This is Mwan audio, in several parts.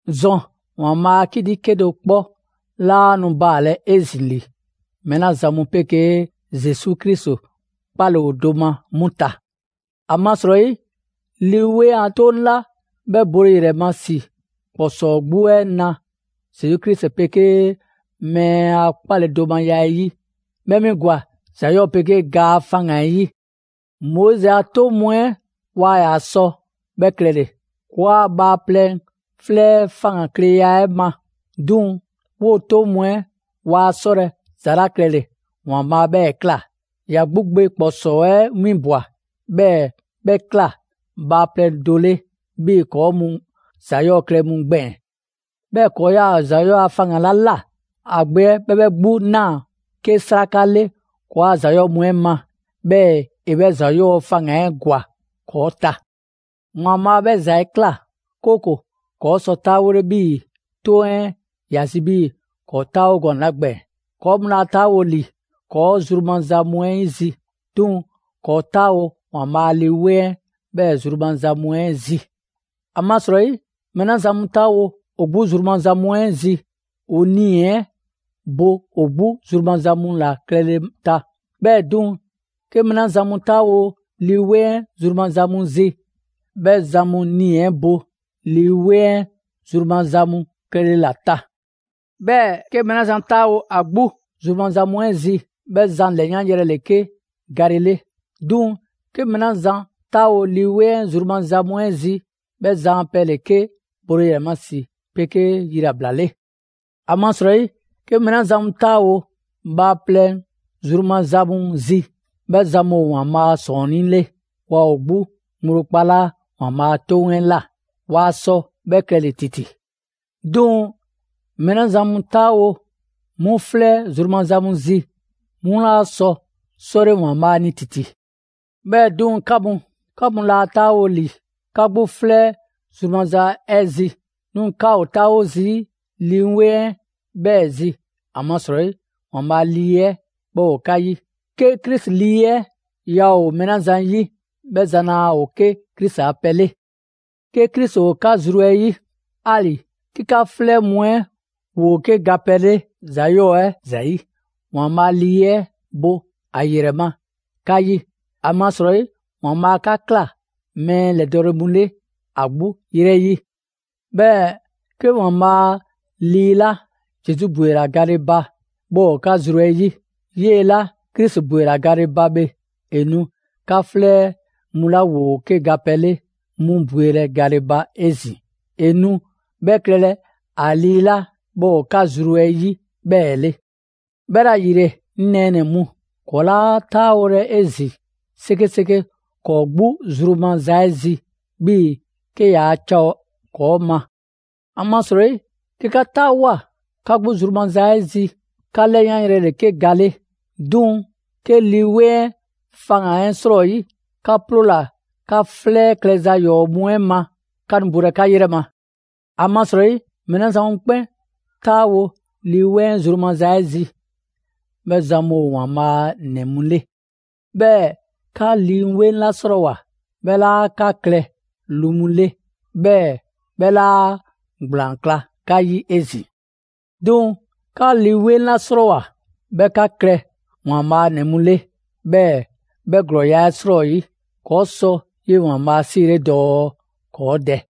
‑Zɔn, ‑Waanbhaa' a 'kiti 'kedo‑ 'kpɔ 'laa nu baalɛ 'ezin‑ ‑li mɛɛ 'la zan mu 'pegee Zesu Krisi 'kpale‑ ‑o do ma 'mu ta. ‑Amasrɔyi Lii 'Weŋ a 'toŋ 'la 'bhɛ bole ‑yrɛ ma ‑si ‑kpɔsɔɔ 'gbu 'ɛ na Zesu Krisi 'pegee mɛɛ a 'kpaledomaya 'ɛ 'yi, 'bhɛ 'mi ‑gwa ‑za 'yɔɔ‑ 'pegee ga faŋgan‑ 'ɛ 'yi. Moizi a 'toŋ mu 'ɛ waa ‑yaa sɔ 'bhɛ klɛle‑, ‑kɔɔa' bhaaplɛŋ 'flɛ 'ɛ faŋgankleya 'ɛ ma. 'Duŋ‑ 'woo‑ 'toŋ mu 'ɛ waa 'sɔlɛ‑ ‑za 'la klɛle‑, ‑Waanbhaa 'bhɛɛ‑ ꞊kla: ‑ya 'gbu Gbe ‑kpɔsɔɔ 'ɛ 'winbwa‑, 'bhɛɛ‑ 'bhɛ ꞊kla bhaaplɛŋ do 'le 'bhii‑ ‑kɔɔ' mu ‑za 'yɔɔ‑ klɛ mu gbɛɛn‑. 'Bhɛɛ‑ ‑kɔɔ' 'yaa‑ ‑za 'yɔɔ‑ a faŋgan‑ 'la ꞊la, ‑a Gbe 'ɛ 'bhɛ 'bhɛ 'gbu ꞊naa 'ke 'sraka 'le ‑kɔɔa' ‑za 'yɔɔ mu 'ɛ ma, 'bhɛɛ‑ ‑e 'bhɛ ‑za 'yɔɔ‑ faŋgan‑ 'ɛ ‑gwa ‑kɔɔ' ta. ‑Waanbhaa' 'bhɛ ‑za 'ɛ ꞊kla, 'kooko‑ ‑kɔɔ' sɔ 'taawole 'bhii‑ 'toŋ 'ɛ ‑ya zi 'bhii‑ ‑kɔɔ' 'taawo gɔnɛ‑ 'la gbɛɛn‑. ‑Kɔɔ' mu laa 'taawo‑ ‑li ‑kɔɔ zru maza mu 'ɛ zi, 'duŋ‑ ‑kɔɔ' 'taawo‑ ‑Waanbhaa' a Lii 'Weŋ 'ɛ 'bhɛɛ‑ zru maza mu 'ɛ zi. ‑Amasrɔyi mɛɛ 'la zan mu 'taawo‑ ‑o 'gbu zru maza mu 'ɛ zi, ‑o 'nii‑ 'ɛ bo ‑o 'gbu zru maza mu ‑la klɛle ta. 'Bhɛɛ‑ 'duŋ‑, 'ke mɛɛ 'la zan mu 'taawo‑ Lii 'Weŋ 'ɛ zru maza mu zi, 'bhɛ zan mu nii‑ 'ɛ bo Lii 'Weŋ 'ɛ zru maza mu klɛle ‑la ta. 'Bhɛɛ‑ 'ke mɛɛ 'la zan 'taawo ‑a 'gbu zru maza mu 'ɛ zi, 'bhɛ zan ‑lɛyanyrɛ ‑le 'ke gale 'le. 'Duŋ‑ 'ke mɛɛ 'la zan 'taawo‑ Lii 'Weŋ 'ɛ zru maza mu 'ɛ zi, 'bhɛ zan a pɛ ‑le 'ke bole ‑yrɛ ma ‑si 'pegee yilabla 'le. ‑Amasrɔyi 'ke mɛɛ 'la zan mu 'taawo‑ bhaaplɛŋ zru maza mu zi, 'bhɛ zan mu ‑o ‑Waanbhaa' ‑sɔɔnnii' 'le; waa ‑o 'gbu ŋgblo kpalaa' ‑Waanbhaa' a 'toŋ 'ɛ ꞊la, waa sɔ 'bhɛ klɛle‑ ‑titi. 'Duŋ‑ mɛɛ 'la zan mu 'taawo‑ 'mu 'flɛ zru maza zi, 'mu 'laa sɔ 'sɔle ‑Waanbhaa' ni ‑titi. 'Bhɛɛ‑ 'duŋ‑ 'ka mu, 'ka mu 'laa 'taawo‑ ‑li 'ka 'gbu 'flɛ zru maza 'ɛ zi, 'duŋ‑ 'ka ‑o 'taawo zii' Lii 'Weŋ 'ɛ 'bhɛɛ‑ zi, ‑amasrɔyi ‑Waanbhaa' Lii 'ɛ 'bhɛ ‑o 'ka 'yi. 'Ke Krisi Lii 'ɛ yaa ‑o mɛɛ 'la zan 'yi, 'bhɛ zan laa ‑o 'ke Krisi a pɛ 'le. 'Ke Krisi ‑o 'ka zru 'ɛ 'yi, 'ali‑ 'ke 'ka 'flɛ mu 'ɛ ‑woo 'ke gapɛ 'le ‑za 'yɔɔ‑ 'ɛ ‑zayi', ‑Waanbhaa' Lii 'ɛ bo ‑a ‑yrɛ ma 'ka 'yi; ‑amasrɔyi ‑Waanbhaa' 'ka ꞊kla mɛɛ ‑lɛdɔɔle mu 'le ‑a 'gbu 'yrɛ 'yi. 'Bhɛɛ‑ 'ke ‑Waanbhaa' Lii 'la Zesu ‑bwela gale ba 'bhɛ ‑o 'ka zru 'ɛ 'yi, 'yee‑ 'la Krisi ‑bwela gale ba bhe, ‑e nu 'ka 'flɛ mu 'la ‑woo 'ke gapɛ 'le 'mu bwelɛ gale ba 'ezin‑. ‑E nu 'bhɛ klɛlɛ ‑a Lii 'la 'bhɛ ‑o 'ka zru 'ɛ 'yi 'bhɛɛ‑ 'le. 'Bhɛla‑ ‑yile, 'ŋ nɛɛnɛ‑ mu, ‑kɔɔ' 'laa 'taawolɛ 'ezin‑ 'sekeseke ‑kɔɔ' 'gbu zru maza 'ɛ zi 'bhii‑ 'ke yaa ca ‑o ‑kɔɔ' ma. ‑Amasrɔyi 'ke 'ka 'taawoa꞊ 'ka 'gbu zru maza 'ɛ zi, 'ka 'lɛyanyrɛ ‑le 'ke gale 'le. 'Duŋ‑ 'ke Lii 'Weŋ 'ɛ faŋgan‑ 'ɛ 'srɔyi, 'ka 'ploola‑ 'ka 'flɛ klɛza ‑yɔɔ' mu 'ɛ ma, 'ka nu bolɛ 'ka 'yrɛ ma. ‑Amasrɔyi mɛɛ 'la zan mu 'kpɛn 'taawo‑ Lii 'Weŋ 'ɛ zru maza 'ɛ zi, 'bhɛ zan mu ‑o ‑Waanbhaa' a ‑nɛ mu 'le. 'Bhɛɛ‑ 'ka Lii 'Weŋ 'la 'srɔɔwoa꞊, 'bhɛ 'laa 'ka klɛ lu mu 'le, 'bhɛɛ‑ 'bhɛ 'laa ‑gblaan 'kla 'ka 'yi 'ezin‑. 'Duŋ‑ 'ka Lii 'Weŋ 'la 'srɔɔwoa‑ 'bhɛ 'ka klɛ ‑Waanbhaa' a ‑nɛ mu 'le, 'bhɛɛ‑ 'bhɛ ‑glɔɔya' 'ɛ 'srɔyi, ‑kɔɔ' sɔ 'yee‑ ‑Waanbhaa' 'siile dɔɔ: «‑Kɔɔ' Dɛ!»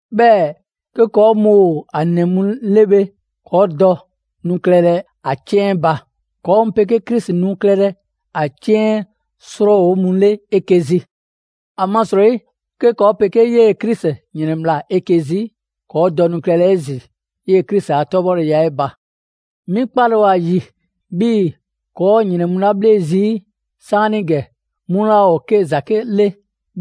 'Bhɛɛ‑ 'ke ‑kɔɔ' mu ‑o ‑a ‑nɛ mu 'le bhe, ‑kɔɔ' dɔ nu klɛlɛ ‑a 'ciɛn 'ɛ ba. ‑Kɔɔ' mu 'pegee Krisi nu klɛlɛ a 'ciɛn 'ɛ 'srɔɔwo mu 'le 'eke‑ zi. ‑Amasrɔyi 'ke ‑kɔɔ' 'pegee 'yee‑ Krisi ‑yrɛnbhla 'eke‑ zi, ‑kɔɔ' dɔ nu klɛlɛ 'ezin‑ 'yee‑ Krisi a 'tɔbhɔleya 'ɛ ba. 'Mi 'kpale ‑o ‑a ‑yi, 'bhii‑ ‑kɔɔ' ‑o ‑yrɛn mu 'la 'bhle zii' 'saanigɛ 'mu 'laa ‑o ‑zake' 'le,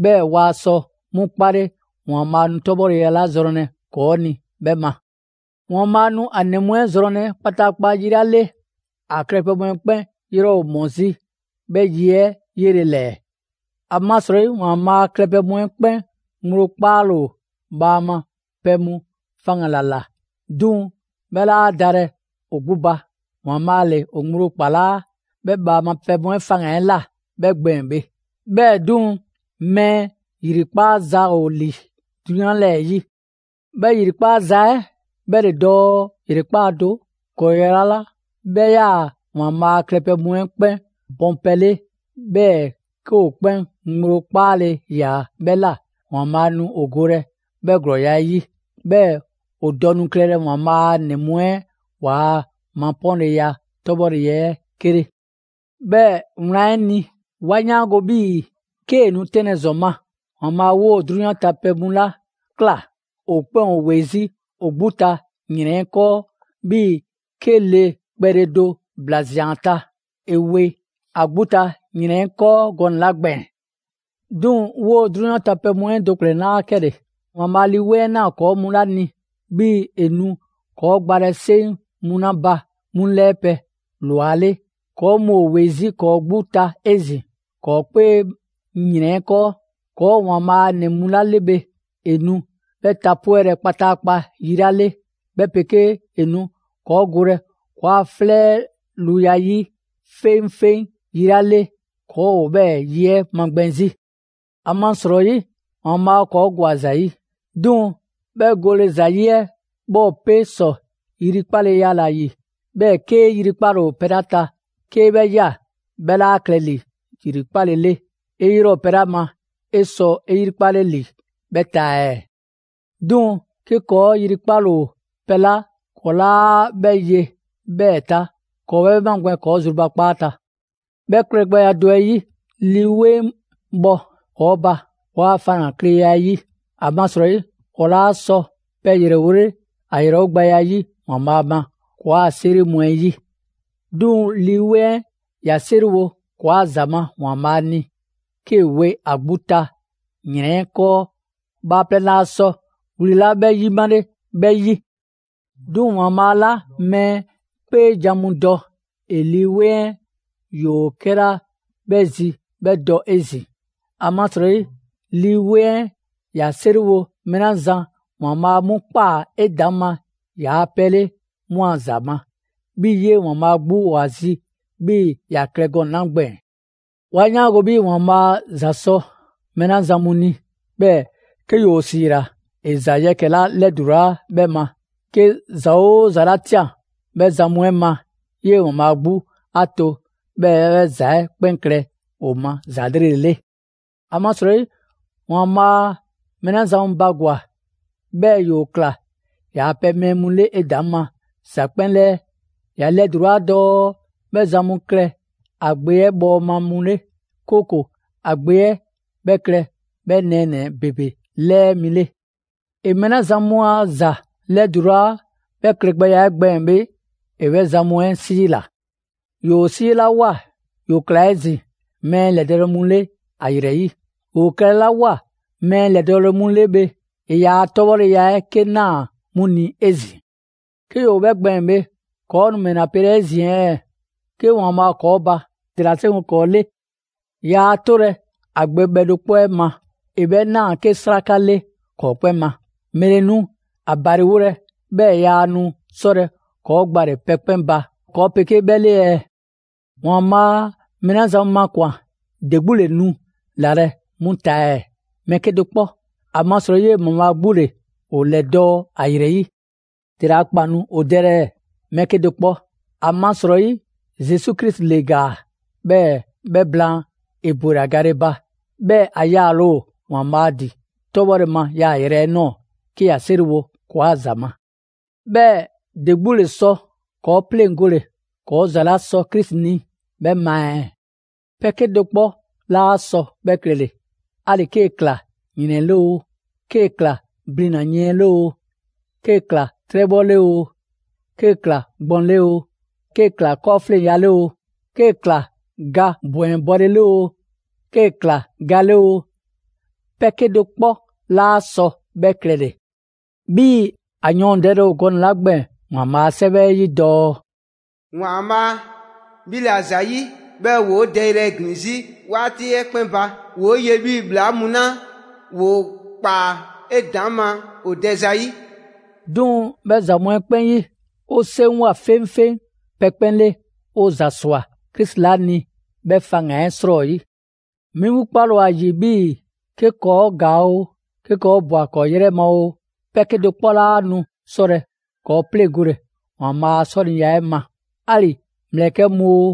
'bhɛɛ‑ ‑waa sɔ 'mu 'kpale ‑Waanbhaa' nu 'tɔbhɔleya 'la zrɔnlɛ ‑kɔɔ' ni 'bhɛ ma. ‑Waanbhaa' nu ‑a ‑nɛ mu 'ɛ zrɔnlɛ kpataakpa yi 'la 'le, ‑a klɛpɛ mu 'ɛ 'kpɛn 'yrɛ ‑o ‑mɔ 'zi 'bhɛ yi 'ɛ 'yele‑ ‑lɛɛ. ‑Amasrɔyi ‑Waanbhaa' klɛpɛ mu 'ɛ 'kpɛn ŋgblo 'kpaale‑ ‑o bhaama pɛ mu faŋgan‑ ‑la ꞊la; 'duŋ‑ 'bhɛ 'laa dalɛ ‑o 'gbu ba, ‑Waanbhaa' ‑le ‑o ŋgblo ‑kpalaa' 'bhɛ bhaama pɛ mu 'ɛ faŋgan‑ 'ɛ ꞊la 'bhɛ gbɛɛn‑ bhe. 'Bhɛɛ‑ 'duŋ‑, mɛɛ ‑yrikpaza ‑o ‑li 'drunyan 'lɛɛ‑ 'yi. 'Bhɛ ‑yrikpaza 'ɛ 'bhɛ ‑le dɔɔ ‑yrekpaa' do, ‑glɔɔya' 'la 'bhɛ 'yaa‑ ‑Waanbhaa' klɛpɛ mu 'ɛ klɛ bɔnpɛ 'le, 'bhɛɛ‑ 'ke ‑o 'kpɛn ŋgblo 'kpaale‑ ‑yaa 'bhɛ ꞊la, ‑Waanbhaa' nu ‑o golɛ 'bhɛ ‑glɔɔya' 'ɛ 'yi. 'Bhɛɛ‑ ‑o dɔ nu klɛlɛ ‑Waanbhaa' a ‑nɛ mu 'ɛ ‑waa' mapɔɔnleya 'tɔbhɔle 'ɛ 'ke 'le. 'Bhɛɛ‑ wlan 'ɛ ni, 'wa 'yaango‑ 'bhii‑ 'kee‑ nu 'tɛnlɛ‑ ‑zɔn ma, ‑Waanbhaa' 'woo‑ 'drunyan ta pɛ mu 'la ꞊kla, ‑o 'kpɛn ‑o ‑we 'zi ‑o 'gbu ta ‑yrɛn 'ɛ ‑kɔɔ' 'bhii‑ 'ke le kpɛle do ‑bla ꞊zian ‑a ta, ‑e we ‑a 'gbu ta ‑yrɛn 'ɛ 'kɔɔ gɔnɛ‑ 'la gbɛɛn‑. 'Duŋ‑ 'woo‑ 'drunyan ta pɛ mu 'ɛ do ‑kplɛn 'laa 'kɛle‑: ‑Waanbhaa' 'a Lii 'Weŋ 'ɛ ꞊naa ‑kɔɔ' mu 'la ni, 'bhii‑ ‑e nu ‑kɔɔ' gbalɛ 'seŋ mu 'la ba 'mu 'lɛɛpɛ‑ ꞊lwa 'le; ‑kɔɔ' mu ‑o ‑we 'zi ‑kɔɔ' 'gbu ta 'ezin‑ ‑kɔɔ' 'kpee ‑yrɛn 'ɛ 'kɔɔ. ‑Kɔɔ' ‑o ‑Waanbhaa' a ‑nɛ mu 'la 'le bhe, ‑e nu 'bhɛ tapwɛlɛ kpataakpa yi 'la 'le, 'bhɛ 'pegee ‑e nu ‑kɔɔ' golɛ ‑kɔɔa' 'flɛ a luya 'ɛ 'yi 'feŋfeŋ yi 'la 'le, ‑kɔɔ' ‑o 'bhɛɛ‑ yi 'ɛ 'magbɛn‑ 'zi. ‑Amasrɔyi ‑Waanbhaa' ‑kɔɔ' ‑gwa ‑za 'yi, 'duŋ‑ 'bhɛ gole ‑zayi' 'ɛ 'bhɛ ‑o 'pe ‑sɔ 'yrikpaleya ‑la ‑yi. 'Bhɛɛ‑ 'kee‑ 'yrikpale ‑o pɛ 'la ta, 'kee 'bhɛ ꞊ya, 'bhɛ 'laa klɛ ‑li ‑yrikpale 'le. 'E 'yrɛ ‑o pɛ 'la ma, 'e sɔ 'e 'yrikpale ‑li 'bhɛ ta ɛɛ? 'Duŋ‑ 'ke ‑kɔɔ' 'yrikpale ‑o pɛ 'la ‑kɔɔ' 'laa 'bhɛ ye 'bhɛɛ‑ ta, ‑kɔɔ' 'bhɛ magbɛn ‑kɔɔ' zrubakpaa ta. 'Bhɛ klɛgbɛya do 'ɛ 'yi, Lii 'Weŋ bhɔ ‑kɔɔ' ba, ‑kɔɔa' faŋgankleya 'ɛ 'yi. ‑Amasrɔyi ‑kɔɔ' 'laa sɔ pɛ ‑yrɛwole ‑a ‑yrɛwogbɛya 'yi ‑Waanbhaa' ma ‑kɔɔa' 'a 'seri mu 'ɛ 'yi. 'Duŋ‑ Lii 'Weŋ 'ɛ ‑ya 'seriwo ‑kɔɔa' ‑za ma ‑Waanbhaa' ni 'kee‑ we ‑a 'gbu ta ‑yrɛn 'ɛ 'kɔɔ bhaaplɛŋ laa sɔ wli 'la 'bhɛ 'yimale 'bhɛ 'yi. 'Duŋ‑ ‑Waanbhaa' 'la mɛɛ 'kpeejan‑ mu dɔ, ‑e Lii 'Weŋ 'ɛ ‑yoo 'kɛla 'bhɛ zi 'bhɛ dɔ 'ezin‑. ‑Amasrɔyi Lii 'Weŋ 'ɛ ‑ya 'seriwo mɛɛ 'la zan ‑Waanbhaa' 'mu ꞊kpaa 'edaŋma ‑yaa' pɛ 'le 'mu a ‑za ma, 'bhii‑ 'yee‑ ‑Waanbhaa' 'gbu ‑o ‑a zi 'bhii‑ ‑ya klɛ gɔnɛ‑ 'la gbɛɛn‑. 'Wa 'yaango‑ 'bhii‑ ‑Waanbhaa' ‑za sɔ mɛɛ 'la zan mu ni, 'bhɛɛ‑ 'ke ‑yoo ‑siila ‑e ‑za yɛkɛ‑ 'la 'lɛdulaa 'bhɛ ma, 'ke ‑za 'oo ‑za 'la ꞊tian 'bhɛ zan mu 'ɛ ma, 'yee‑ ‑Waanbhaa' 'gbu 'a to 'bhɛɛ‑ 'bhɛ ‑za 'ɛ 'kpɛn klɛ ‑o ma ‑za 'lrele‑ 'le. ‑Amasrɔyi ‑Waanbhaa' mɛɛ 'la zan mu bagwa‑, 'bhɛɛ‑ ‑yoo ꞊kla ‑yaa' pɛ mɛɛ mu 'le 'edaŋma ‑za 'kpɛn 'lɛɛ; ‑ya 'lɛdulaa dɔɔ 'bhɛ zan mu klɛ ‑a Gbe 'ɛ bhɔɔma mu 'le, 'kooko‑ ‑a Gbe 'ɛ 'bhɛ klɛ 'bhɛ nɛɛnɛ‑ ‑bebe 'lɛɛ mi 'le. ‑E mɛɛ 'la zan mu ‑a ‑za 'lɛdulaa 'bhɛ klɛgbɛya 'ɛ gbɛɛn‑ bhe, ‑e 'bhɛ zan mu 'ɛ ‑siila; ‑yoo 'siilawoa, ‑yoo ꞊kla 'ezin‑ mɛɛ ‑lɛdɔɔle mu 'le ‑a ‑yrɛ 'yi; ‑yoo klɛlawoa mɛɛ ‑lɛdɔɔle mu 'le bhe, ‑e ‑yaa' 'tɔbhɔleya 'ɛ 'ke ꞊naa 'mu ni 'ezin‑. 'Ke ‑yoo 'bhɛ gbɛɛn‑ bhe, ‑kɔɔ' nu ‑mɛla pelɛ 'ezin‑ ɛɛ? 'Ke ‑Waanbhaa' ‑o ‑kɔɔ' ba, ‑dela 'seŋgo‑ ‑kɔɔ' 'le? Yaa 'tolɛ‑ ‑a Gbe bhɛ do 'kpɔ 'ɛ ma. ‑E 'bhɛ ꞊naa 'ke 'sraka 'le ‑kɔɔ' 'kpɛn ma. ‑Mɛle nu ‑a ‑baliwolɛ 'bhɛɛ‑ yaa nu 'sɔlɛ‑ ‑kɔɔ' gbale‑ pɛ 'kpɛn ba ‑kɔɔ' 'pegee 'bhɛ 'le ɛɛ? ‑Waanbhaa' mɛɛ 'la zan mu makwan‑, ‑de 'gbu ‑le nu ‑lalɛ' 'mu ta ɛɛ? Mɛɛ 'kedo‑ 'kpɔ! ‑Amasrɔyi 'yee‑ ‑Waanbhaa' 'gbu ‑le ‑o ‑lɛdɔɔ' ‑a ‑yrɛ 'yi. ‑Dele a ‑kpan nu ‑o dɛlɛ ɛɛ? Mɛɛ 'kedo‑ 'kpɔ! ‑Amasrɔyi Zesu Krisi ‑le ‑gaa, 'bhɛɛ 'bhɛ blaan, ‑e ‑bwela gale ba; 'bhɛɛ‑ ‑a yaale ‑o ‑Waanbhaa' ‑din 'tɔbhɔ ma yaayrɛ 'ɛ ꞊nɔɔ, 'ke ‑ya 'seriwo ‑kɔɔa' ‑za ma. 'Bhɛɛ‑ ‑de 'gbu ‑le sɔ ‑kɔɔ' 'pleŋgole ‑kɔɔ' ‑za 'la sɔ Krisi ni 'bhɛ ma ɛɛ? Pɛ 'kedo‑ 'kpɔ 'laa sɔ 'bhɛ klɛle! 'Ali‑ 'kee‑ ꞊kla ‑yrɛn 'le oo, 'kee‑ ꞊kla blina‑ yiɛn 'le oo, 'kee‑ ꞊kla 'trɛbhɔ 'le oo, 'kee‑ ꞊kla gbɔn 'le oo, 'kee‑ ꞊kla 'kɔɔfleŋya 'le oo, 'kee‑ ꞊kla ga ‑bwɛnbɔle 'le oo, 'kee‑ ꞊kla ga 'le oo, pɛ 'kedo‑ 'kpɔ 'laa sɔ 'bhɛ klɛle‑! 'Bhii‑ ‑a yɔɔndɛle ‑o gɔnɛ‑ 'la gbɛɛn‑ ‑Waanbhaa' a 'Sɛwɛ 'ɛ 'yi dɔɔ: «‑Waanbhaa', 'bhi 'la ‑zayi', 'bhɛɛ‑ ‑woo 'o dɛyrɛ ‑glin 'zi 'waati 'ɛ 'kpɛn ba; ‑woo' ye 'bhii‑ ‑bhlaa mu 'la ‑woo ꞊kpaa 'edaŋma ‑o dɛ zayi'.» 'Duŋ‑ 'bhɛ ‑za mu 'ɛ 'kpɛn 'yi, 'o 'seŋgwa‑ 'feŋfeŋ pɛ 'kpɛn 'le 'o ‑za ‑swa Krisi 'la ni 'bhɛ faŋgan‑ 'ɛ 'srɔyi. 'Mi 'gbu 'kpale‑ ‑o ‑a ‑yi 'bhii‑ 'ke ‑kɔɔ' ‑gaa oo, 'ke ‑kɔɔ' ꞊bwa ‑kɔɔ' 'yrɛ ma oo, pɛ 'kedo‑ 'kpɔ 'laa nu 'sɔlɛ‑ ‑kɔɔ' 'pleŋgole ‑Waanbhaa' a 'sɔniya 'ɛ ma: 'ali‑ ‑mlɛkɛ' mu oo,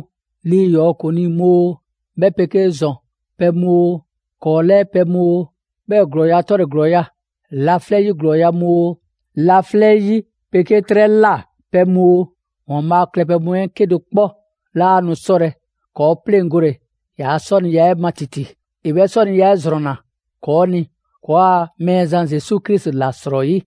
lii ‑yɔɔ ‑kuŋlii mu oo, 'bhɛ 'pegee ‑zɔn pɛ mu oo, ‑kɔɔ' 'lɛɛ pɛ mu oo; 'bhɛɛ‑ ‑glɔɔya' 'tɔle‑ ‑glɔɔya', laflɛ' 'yi ‑glɔɔya' mu oo, laflɛ' 'yi 'pegee 'trɛ ꞊la pɛ mu oo, ‑Waanbhaa' klɛpɛ mu 'ɛ 'kedo‑ 'kpɔ 'laa nu 'sɔlɛ‑ ‑kɔɔ' 'pleŋgole ‑yaa' 'sɔniya 'ɛ ma ‑titi. ‑E 'bhɛ 'sɔniya 'ɛ ‑zrɔnna ‑kɔɔ' ni ‑kɔɔa' Mɛɛzan Zesu Krisi ‑la 'srɔyi.